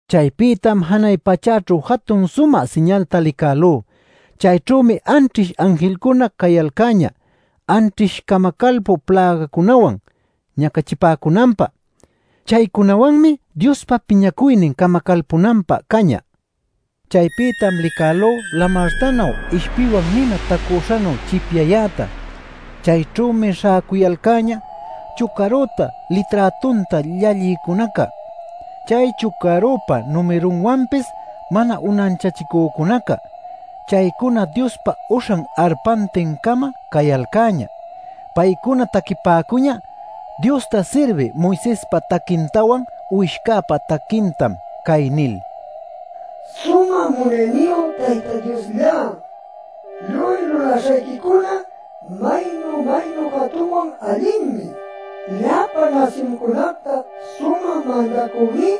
Chaypïtam janay pachäćhu jatun sumä siñalta licälú. Chayćhümi anćhish anjilcuna cayalcäñä anćhish camacalpü plägacunawan ñacachipäcunanpä. Chaycunawanmi Diospa piñacuynin camacalpunanpä cañä. Chaypïtam licälú lamartanuy, ishpiwan nina tacüśhanuy chipyayäta. Chayćhümi śhäcuyalcäña chucarüta, liträtunta llallïcunaca, chay chucarüpa numirunwanpis mana unanchachicücunaca. Chaycuna Diospa uśhan arpantin-camam cayalcäñä. Paycuna taquipäcuñä Diosta sirbï Moisespa taquintawan, Uwishcäpa taquintam cay nil: “¡Sumä munayniyu Tayta Diosllá; Lluy lulaśhayquicuna maynu-maynu jatunwan allinmi! Llapa nasyuncunacta Sumä Mandacüní,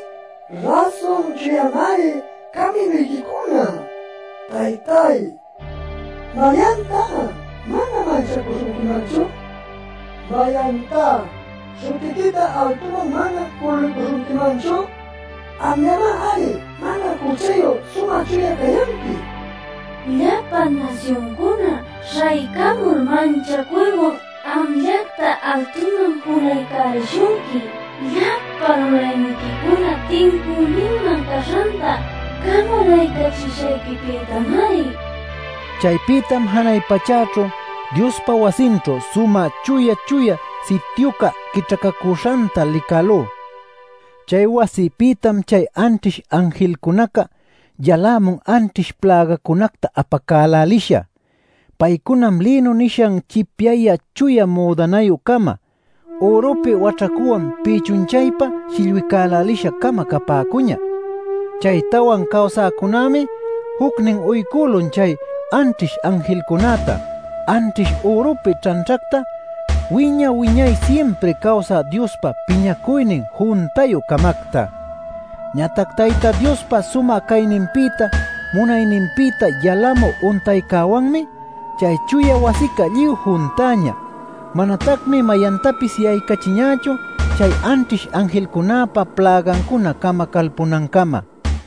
Rasun chuyamari caminuyquicuna. Taytay ¿mayantá mana manchacuśhunquimanchu? ¿Mayantá śhutiquita altuman mana juluycuśhunquimanchu? Amllamari mana juchayu sumä chuya cayanqui. Llapa nasyuncuna śhaycamul manchacuywan amllacta altuman julaycälishunqui llapa lulayniquicuna tincüninman caśhanta camalaycachishayquipïtamari” nil. Chaypïtam janay pachäćhu Diospa wasinćhu Sumä Chuya Chuya Sityuca quićhacacüśhanta licälú. Chay wasipïtam chay anćhish anjilcunaca yalämun anćhish plägacunacta apacälälisha. Paycunam lïnu nishan chipyayä chuya müdanayü-cama, ürupi waćhacuwan pïchun-chaypa shillwicälälisha-cama capäcuñä. Chay tawan cawsäcunämi jucnin uycülun chay anćhish anjilcunäta anćhish ürupi ćhanćhacta, wiña-wiñay simpri cawsä Diospa piñacuynin juntayü-camacta. Ñatac Tayta Diospa sumä cayninpïta munayninpïta yalamü untaycäwanmi chay chuya wasica lluy juntäñä. Manatacmi mayantapis yaycachiñächu chay anćhish anjilcunäpa plägancuna camacalpunancamá.